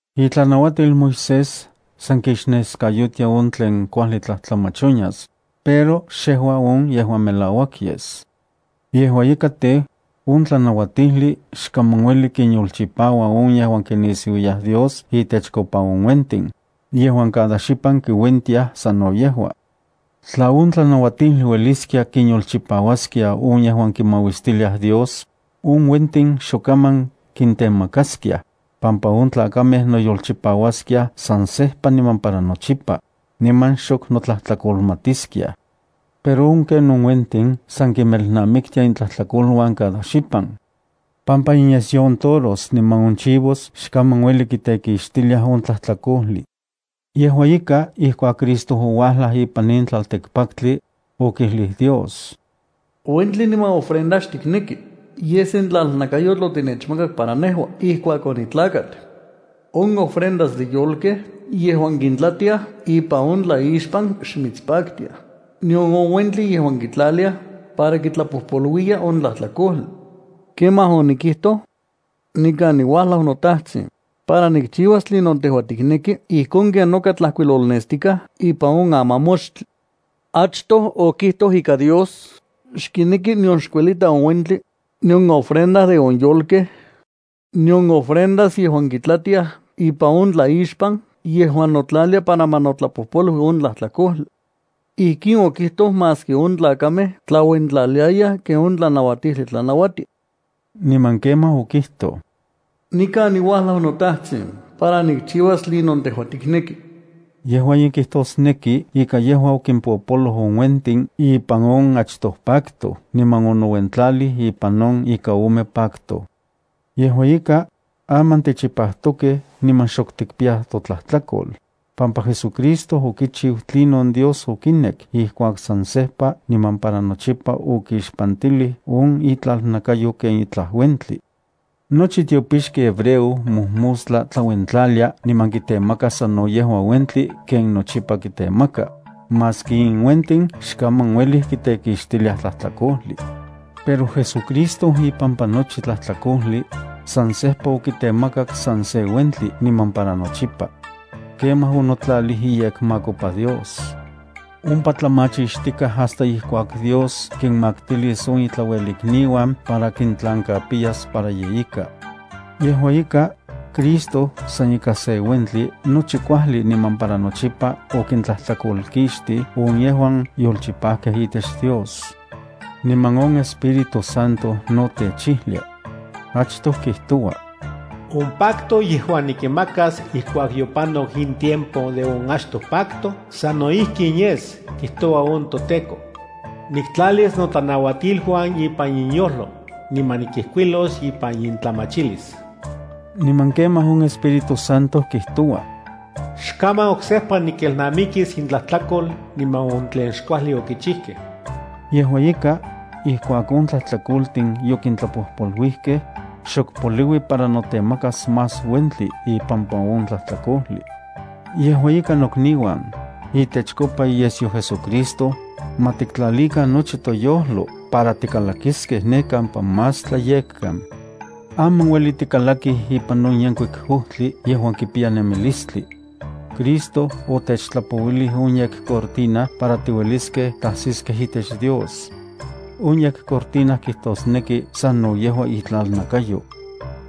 Itlanauatil Moisés san kixneskayotia on tlen kuajli tlajtlamach onyas, pero xejua on yejuan melauak yes. Yejua ika tej, on tlanauatijli xkaman ueli kinyolchipaua on yejuan kinisiuiyaj Dios itechkopa on uentin, yejuan cada xipan kiuentiaj sano yejua. Tla on tlanauatijli ueliskia kinyolchipauaskia on yejuan kinmauistiliaj Dios, on uentin xok kaman kintemakaskiaj, pampa on tlakamej noyolchipauaskiaj san sejpa niman para nochipa, niman xok kinnotlajtlakolmatiskiaj. Pero on ken on uentin san kinmelnamiktia intlajtlakoluan cada xipan, pampa inyesyo on toros niman on chivos xkaman ueli kitekixtiliaj on tlajtlakojli. Yejua ika, ijkuak Cristo ouajlaj ipan in tlaltikpaktli, okijlij Dios: Uentli niman ofrenda xtikneki. Yej sen tlalnakayotl otinechmakak para nejua ijkuak onitlakat. On ofrendas de yolkej yejuan kintlatiaj ipan on tlaixpan xmitspaktiaj, nion on uentli yejua kitlaliaj para kitlapojpoluiya on tlajtlakojli. Kemaj onikijtoj: “Nikan niuajlau, noTajtsin, para nikchiuas tlinon tejua tikneki ijkon ken noka tlajkuilolnestikaj ipan on amamoxtli.” Achtoj okijtoj ika Dios xkineki nion xkuelita on uentli, nion ofrenda de on yolkej, nion ofrendas yejuan kitlatiaj ipan on tlaixpan yejuan notlalia para ma notlapojpolui on tlajtlakojli. Ijkin okijtoj maski on tlakamej tlauentlaliayaj ken on tlanauatijli tlanauatia. Niman kemaj okijtoj: “Nikan niuajlau, noTajtsin, para nikchiuas tlinon tejua tikneki.” Yejua in kijtosneki ika yejua okimpopoloj on uentin ipan on achtoj pacto niman onouentlalij ipan on ika ome pacto. Yejua ika, aman tichipajtokej niman xok tikpiyaj totlajtlakol, pampa JesuCristo okichiu tlinon Dios okinek ijkuak san sejpa niman para nochipa okixpantilij on itlalnakayo ken itlaj uentli. Nochi tiopixki hebreo mojmostla tlauentlalia niman kitemaka sano yejua uentli ken nochipa kitemaka, maski in uentin xkaman uelij kitekixtiliaj tlajtlakojli. Pero JesuCristo ipampa nochi tlajtlakojli, san sejpa okitemakak san se uentli niman para nochipa. Kemaj onotlalij iyekmakopa Dios. Ompa tlamachixtikaj hasta ijkuak Dios kinmaktilis on itlauelikniuan para kintlankapiyas para ye ika. Yejua ika, Cristo san ika se uentli nochi kuajli niman para nochipa okintlajtlakolkixtij on yejuan yolchipajkej itech Dios. Niman on Espíritu Santo no techijlia. Achtoj kijtoua: On pacto yejuan nikinmakas ijkuak yopanok in tiempo de on achtoj pacto sano ijkin yes, kijtoua on toTEKO: Nikintlalis notlanauatiluan ipan inyojlo, niman nikinmijkuilos ipan intlamachilis. Niman kemaj on Espíritu Santo kijtoua: Xkaman oksejpa nikelnamikis intlajtlakol niman on tlen xkuajli okichijkej. Yejua ika, ijkuak on tlajtlakoltin yokitlapojpoluijkej, xok poliui para notemakas más uentli ipampa on tlajtlakojli. Yejua ika nokniuan, itechkopa iyesyo JesuCristo, ma tiktlalikan toyojlo para tikalakiskej ne kampa Más Tlayekkan. Aman ueli tikalakij ipan on yenkuik ojtli yejuan kipiya nemilistli. Cristo otechtlapouilij on yekcortina para tiueliskej tajsiskej itech Dios. On yekcortina kijtosneki sano yejua itlalnakayo.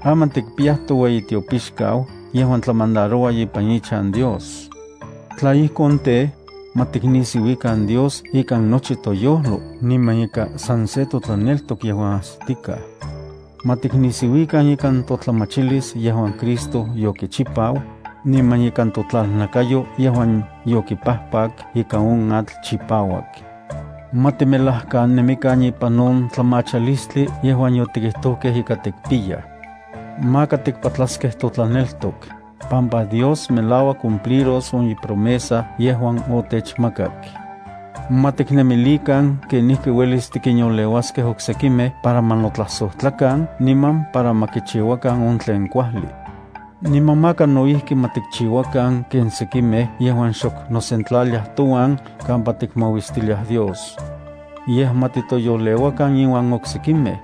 Aman tikpiyaj toueyitiopixkau yejuan tlamandaroua ipan ichan Dios. Tla ijkon tej, ma tiknisiuikan Dios ikan nochi toyojlo niman ikan san se totlaneltok yejuan ajsitikaj. Ma tiknisiuikan ikan totlamachilis yejuan Cristo yokichipau, niman ikan totlalnakayo yejuan yokipajpak ika on atl chipauak. Ma timelajkanemikan ipan on tlamachalistli yejuan yotikijtojkej ika tikpiyaj. Maka tikpatlaskej totlaneltok, pampa Dios melauak cumpliros on ipromesa yejuan otechmakak. Ma tiknemilikan kenijki uelis tikinyoleuaskej oksekimej para ma notlajsojtlakan niman para ma kichiuakan on tlen kuajli. Niman maka no ijki ma tikchiuakan ken sekimej yejuan xok nosentlaliaj touan kampa tikmauistiliaj Dios. Yej ma titoyoleuakan iuan oksekimej,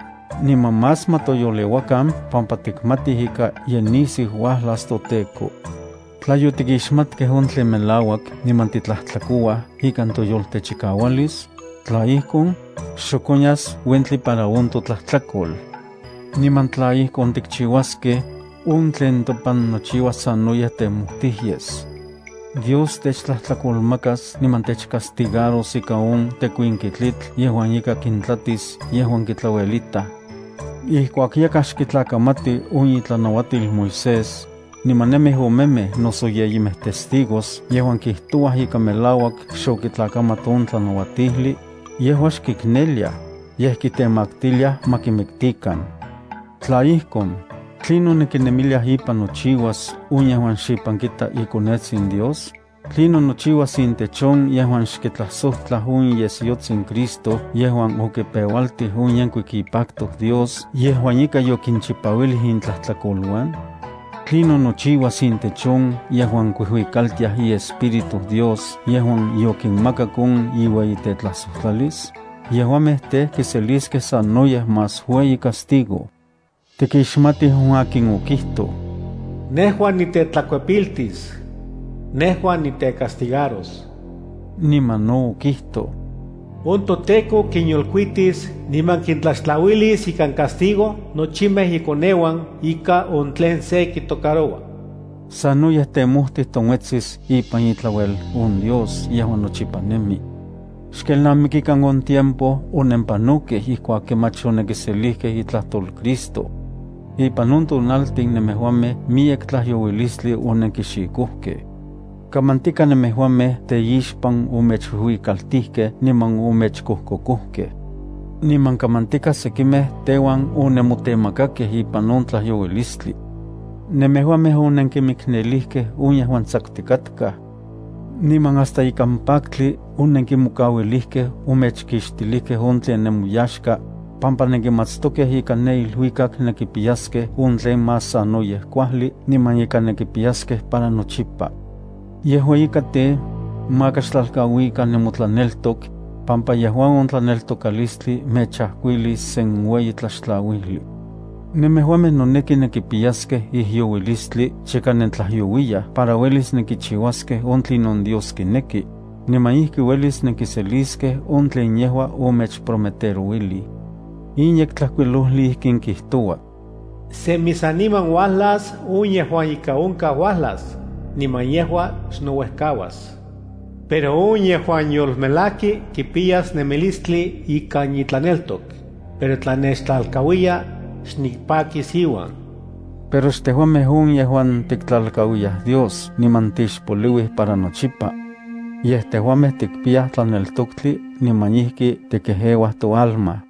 niman más ma toyoleuakan pampa tikmatij ika ye nisiu uajlas toTEKO. Tla yotikixmatkej on tlen melauak niman titlajtlakouaj ikan toyoltechikaualis, tla ijkon, xok onyas uentli para on totlajtlakol. Niman tla ijkon tikchiuaskej, on tlen topan nochiuas sanoyej temojtij yes. Dios techtlajtlakolmakas niman techcastigaros ika on tekuinki tlitl yejuan ika kintlatis yejuan kitlauelitaj. Ijkuak yakaj xkitlakamati on itlanauatil Moisés, niman nemij omemej noso yeyimej testigos yejuan kijtouaj ika melauak xokitlakamat on tlanauatijli, yejua xkikneliaj, yej kitemaktiliaj ma kimiktikan. Tla ijkon, ¿tlinon nenkinemiliaj ipan nochiuas on yejuan xipan kita iKonetsin Dios? ¿Tlinon nochiuas intech on yejuan xkixtlajsojtlaj on iyesyotsin Cristo yejuan okipeualtij on yenkuik ipacto Dios yejuan ika yokinchipauilij intlajtlakoluan? ¿Tlinon nochiuas intech on yejuan kuijuikaltiaj iEspíritu Dios yejuan yokinmakak on iueyitetlajsojtlalis? Yejuamej tej, kiseliskej sanoyej más ueyi castigo. Tikixmatij on akin okijtoj: “Nejua nitetlakuepiltis. Nejua nitecastigaros.” Niman no okijtoj: “On toTEKO kinyolkuitis niman kintlaxtlauilis ikan castigo nochimej ikoneuan ika on tlen se kitocaroua.” Sanoyej temojtij tla se onuetsis ipan itlauel on Dios yejuan nochipa nemi. Xkelnamikikan on tiempo onenpanokej ijkuak kemach onenkiselikej itlajtol Cristo. Ipan on tonaltin nemejuamej miyek tlajyouilistli onenkixikojkej. Kamantika nemejuamej teixpan omechuijuikaltijkej niman omechkojkokojkej. Niman kamantika sekimej teuan onenmotemakakej ipan on tlajyouilistli. Nemejuamej onenkimiknelijkej on yejuan tsakutikatkaj. Niman hasta ikan paktli onenkimokauilijkej omechkixtilijkej on tlen nemoyaxka, pampa nenkimatstokej ika ne iluikak nenkipiyaj on tlen más sanoyej kuajli niman ika nenkipiyaskej para nochipa. Yejua ika tej, maka xtlalkauikan nemotlaneltok, pampa yejua on tlaneltokalistli mechajkuilis sen ueyi tlaxtlauijli. Nemejuamej noneki nenkipiyaskej ijyouilistli chika nentlajyouiyaj para uelis nenkichiuaskej on tlinon Dios kineki, niman ijki uelis nenkiseliskej on tlen yejua omechprometerouilij. In Yektlajkuilojli ijkin kijtoua: Semi saniman uajlas on yejuan ika onkaj uajlas, niman yejua xnouejkauas. Pero on yejuan yolmelajki kipiyas nemilistli ikan itlaneltok, pero tla nechtlalkauiya, xnipakis iuan. Pero xtejuamej on yejuan tiktlalkauiyaj Dios niman tixpoliuij para nochipa. Yej tejuamej tikpiyaj tlaneltoktli niman ijki tikejeuaj toalma.